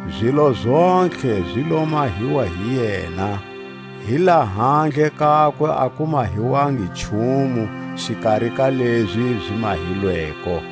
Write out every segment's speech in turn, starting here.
Zilo zontlhe zi lo mahiwa hi yena; hi lahandle kakwe a ku mahiwangi nchumu xikari ka lezi zi mahilweko.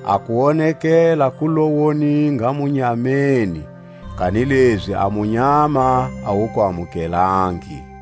A kuwonekela ku lo woninga munyameni, kanilezi a munyama a wu ku amukelangi.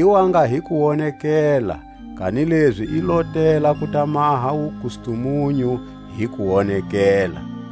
I wa nga hi kuwonekela, kanilezi i lo tela ku ta maha wukustumunyu hi kuwonekela.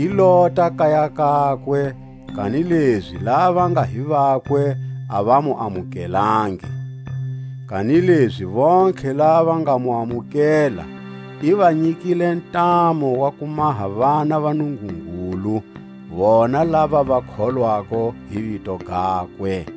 I lota kaya kakwe, kanilezi lava va nga hi vakwe a va mu amukelangi. Kanilezi vontlhe lava va nga mu amukela, i va nyikile ntamu wa ku maha vana va Nungungulu, vona lava va kholwako hi vito gakwe;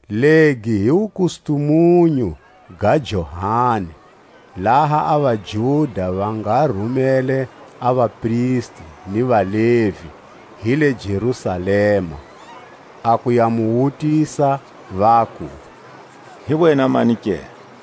Legi hi wukustumunyu ga Johani, laha a vaJuda va nga rumele a vapristi ni vaLevi hi le Jerusalema, a ku ya mu wutisa, vaku: Hi wena mani ke?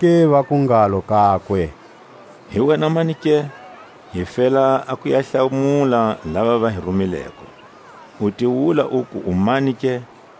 Zonake vaku ngalo kakwe: Hi wena mani ke? Hi fela ku ya va hlamula lava va hi rumileko. U ti wula uku u mani ke?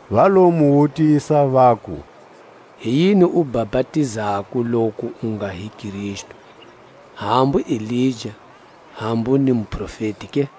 Va lo mu wutisa, vaku: Hi yini u bapatizako loku u nga hi Kristu, hambu Elija, hambu ni Muprofeti ke?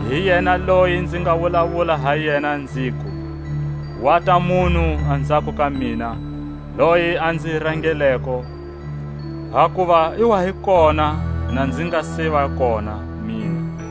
Hi yena loyi nzi nga wulawula ha yena nziku: Wata munhu anzhako ka mina loyi a nzi rangeleko; hakuva i wa hi kona na nzi nga se va kona mina.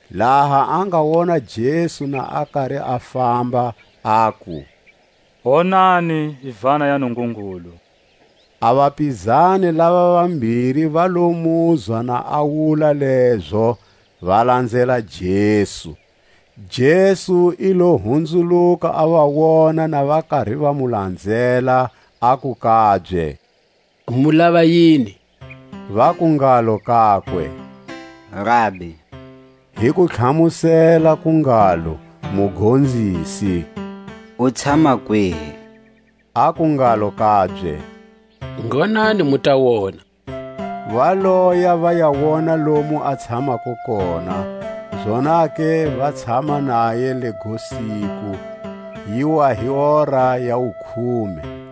Laha a nga wona Jesu na a kari a famba, aku: Wonani Yivana ya Nungungulu! A vapizani lava vambiri va lo muzwa na a wula lezo, va lanzela Jesu. Jesu i lo hunzuluka, a va wona na va kari va mu lanzela, aku kabye: Mu lava yini? Vaku ngalo kakwe: Rabi (hi kutlhamusela ku ngalo, Mugonzisi), u tshama kwihi? Aku ngalo kabye: Ngonani, mu ta wona. Va loya va ya wona lomu a tshamako kona; zonake va tshama naye lego siku; yi wa hi hora ya wukhume.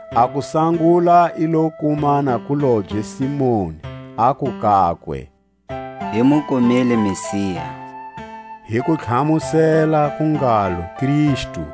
A kusangula i lo kuma nakulobye Simoni, aku kakwe: Hi mu kumile Messia, (hi kutlhamusela ku ngalo, Kristu).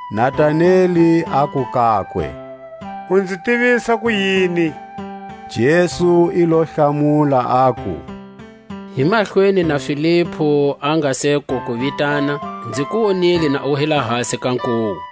Nataneli aku kakwe: U nzi tivisa kuyini? Jesu i lo hlamula, aku: Hi mahlweni na Filipu a nga se ku ku vitana, nzi ku wonile na u hi lahasi ka nkuwu.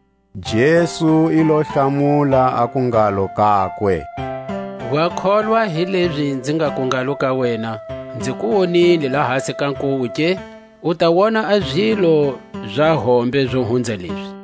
Jesu i lo hlamula, aku ngalo kakwe: Wa kholwa hilezi nzi ngaku ngalo ka wena: Nzi ku wonile lahasi ka nkuwu ke? U ta wona a zilo za hombe zo hunza lezi.